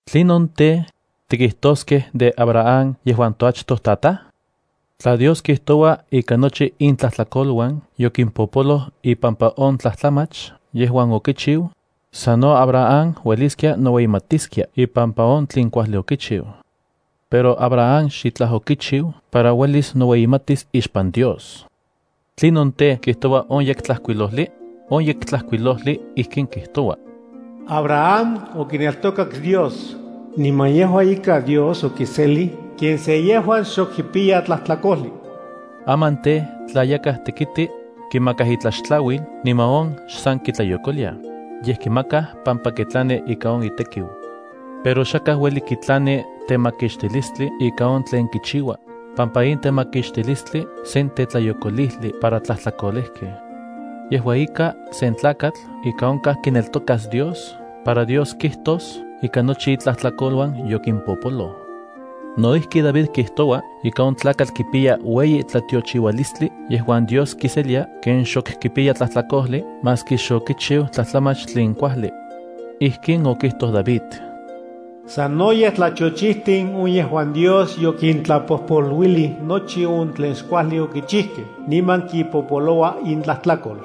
¿Tlinon tej, tikijtoskej de Abraham yejuan toachtojtataj? Tla Dios kijtoua ika nochi itlajtlakoluan yokimpopoloj ipampa on tlajtlamach yejuan okichiu, sano Abraham ueliskia noueyimatiskia ipampa on tlen kuajli okichiu. Pero Abraham xitlaj okichiu para uelis noueyimatis ixpan Dios. ¿Tlinon tej, kijtoua on Yektlajkuilojli? On Yektlajkuilojli ijkin kijtoua: “Abraham okineltokak Dios, niman yejua ika Dios okiselij ken se yejuan xok kipiya tlajtlakojli.” Aman tej, tla yakaj tekiti, kimakaj itlaxtlauil niman on xsan kitlayokoliaj, yej kimakaj pampa kitlani ika on itekiu. Pero xakaj ueli kitlani temakixtilistli ikan on tlen kichiua, pampa in temakixtilistli sen tetlayokolijli para tlajtlakolejkej. Yejua ika, sen tlakatl ika onkaj kineltokas Dios para Dios kijtos ika nochi itlajtlakoluan yokimpopoloj. No ijki David kijtoua ika on tlakatl kipiya ueyi tlatiochiualistli yejuan Dios kiselia ken xok kipiya tlajtlakojli maski xokichiu tlajtlamach tlen kuajli. Ijkin okijtoj David: Sanoyej tlatiochijtin on yejuan Dios yokintlapojpoluilij nochi on tlen xkuajli okichijkej niman kipopoloua intlajtlakol.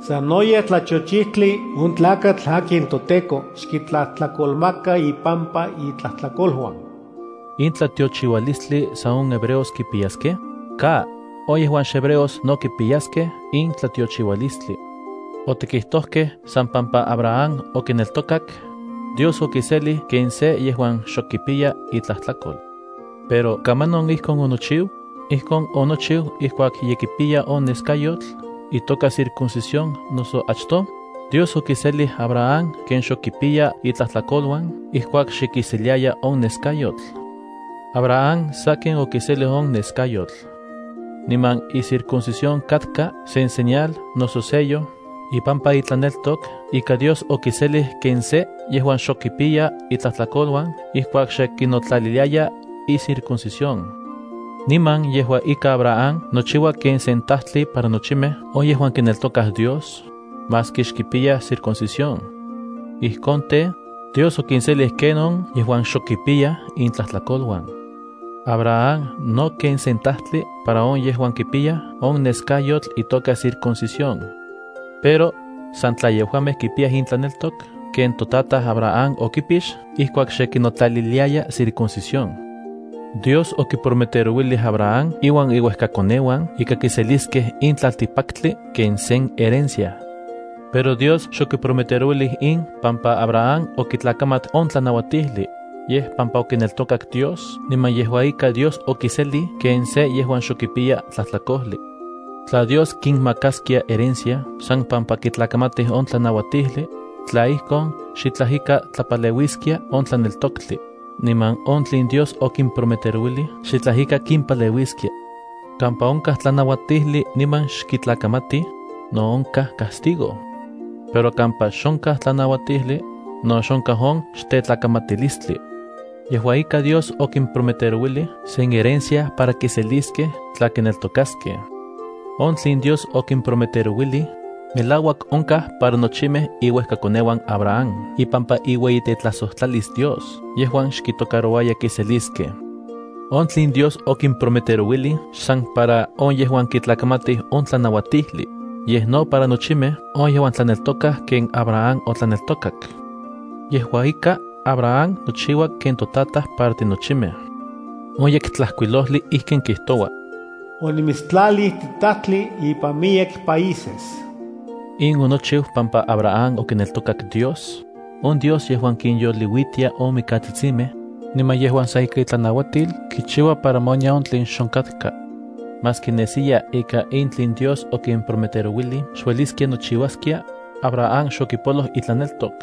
Sanoyej tlatiochijtli on tlakatl akin toTEKO xkitlajtlakolmaka ipampa itlajtlakoluan. ¿In tlatiochiualistli san on hebreos kipiyaskej? ¡Ka! On yejuan xhebreos no kipiyaskej in tlatiochiualistli. Otikijtojkej san pampa Abraham okineltokak, Dios okiselij ken se yejuan xok kipiya itlajtlakol. Pero ¿kamanon ijkon onochiu? ¿Ijkon onochiu ijkuak ye kipiya on neskayotl itoka circuncisión noso achtoj? Dios okiselij Abraham ken xok kipiya itlajtlakoluan ijkuak xe kiseliaya on neskayotl. Abraham sakin okiselij on neskayotl. Niman icircuncisión katka sen señal noso sello ipampa itlaneltok ika Dios okiselij ken se yejuan xok kipiya itlajtlakoluan ijkuak xe kinotlaliliaya icircuncisión. Niman yejua ika Abraham nochiua ken sen tajtli para nochimej on yejuan kineltokaj Dios, maski xkipiyaj circuncisión. Ijkon tej, Dios okinselij ken on yejuan xok kipiyaj itlajtlakoluan. Abraham no ken sen tajtli para on yejuan kipiyaj on neskayotl itoka circuncisión. Pero san tla yejuamej kipiyaj intlaneltok ken totataj Abraham okipix ijkuak xe kinotlaliliaya circuncisión. Dios okiprometerouilij Abraham iuan iuejkakoneuan ika kiseliskej in tlaltikpaktli ken sen herencia. Pero Dios xokiprometerouilij in pampa Abraham okitlakamat on tlanauatijli, yej pampa okineltokak Dios niman yejua ika Dios okiselij ken se yejuan xok kipiya tlajtlakojli. Tla Dios kinmakaskia herencia san pampa kitlakamatij on tlanauatijli, tla ijkon, xitlaj ika tlapaleuiskia on tlaneltoktli, niman on tlen Dios okiprometerouilij xitlaj ika kipaleuiskia. Kampa onkaj tlanauatijli niman xkitlakamatij, no onkaj castigo. Pero kampa xonkaj tlanauatijli, no xonkaj on xtetlakamatilistli. Yejua ika Dios okimprometerouilij sen herencia para kiseliskej tla kineltokaskej. On tlen Dios okimprometerouilij, melauak onkaj para nochimej iuejkakoneuan Abraham ipampa iueyitetlajsojtlalis Dios yejuan xkitocarouaya kiseliskej. On tlen Dios okimprometerouilij xsan para on yejuan kitlakamatij on tlanauatijli, yej no para nochimej on yejuan tlaneltokaj ken Abraham otlaneltokak. Yejua ika, Abraham nochiua ken totataj para tinochimej. On Yektlajkuilojli ijkin kijtoua: “Onimitstlalij titajtli ipan miyek países.” In onochiu pampa Abraham okineltokak Dios, on Dios yejuan kinyoliuitia on mikatsitsimej, niman yejuan san ika itlanauatil kichiua para ma onya on tlen xonkatka. Maski nesiya ika in tlen Dios okimprometerouilij xueliskia nochiuaskia, Abraham xokipoloj itlaneltok,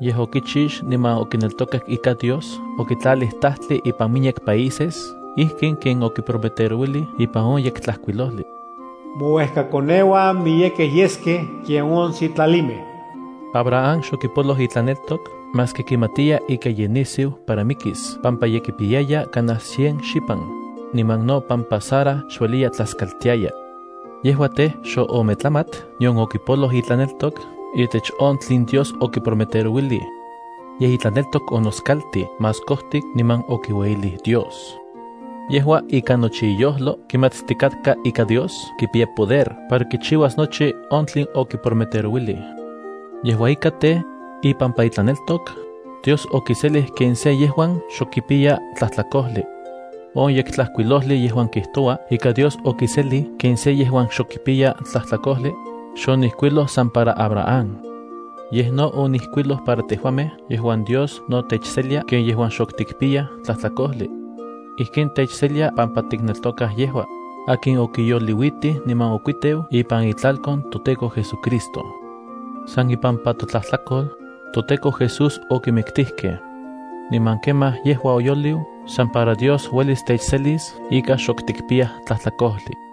yej okichix niman okineltokak ika Dios okitlalij tajtli ipan miyek países ijkin ken okiprometerouilij ipan on Yektlajkuilojli: “Mouejkakoneuan miyekej yeskej ken on sitlalimej.” Abraham xokipoloj itlaneltok maski kimatiya ika ye nisiu para mikis pampa ye kipiyaya kanaj cien xipan, niman no pampa Sara xueliya tlaskaltiaya. Yejua tej, xoometlamat nion okipoloj itlaneltok itech on tlen Dios okiprometerouilij. Yej itlaneltok onoskaltij más kojtik niman okiueyilij Dios. Yejua, ikan nochi iyojlo kimatstikatka ika Dios kipiya poder para kichiuas nochi on tlen okiprometerouilij. Yejua ika tej, ipampa itlaneltok, Dios okiselij ken se yejuan xok kipiya tlajtlakojli. On Yektlajkuilojli yejuan kijtoua ika Dios okiselij ken se yejuan xok kipiya tlajtlakojli, xonijkuiloj san para Abraham. Yej no onijkuiloj para tejuamej yejuan Dios no techselia ken yejuan xok tikpiyaj tlajtlakojli. Ijkin techselia pampa tikneltokaj yejua, akin okiyoliuitij niman okuiteu ipan itlalkon toTEKO JesuCristo. San ipampa totlajtlakol, toTEKO Jesús okimiktijkej. Niman kemaj yejua oyoliu san para Dios uelis techselis ika xok tikpiyaj tlajtlakojli.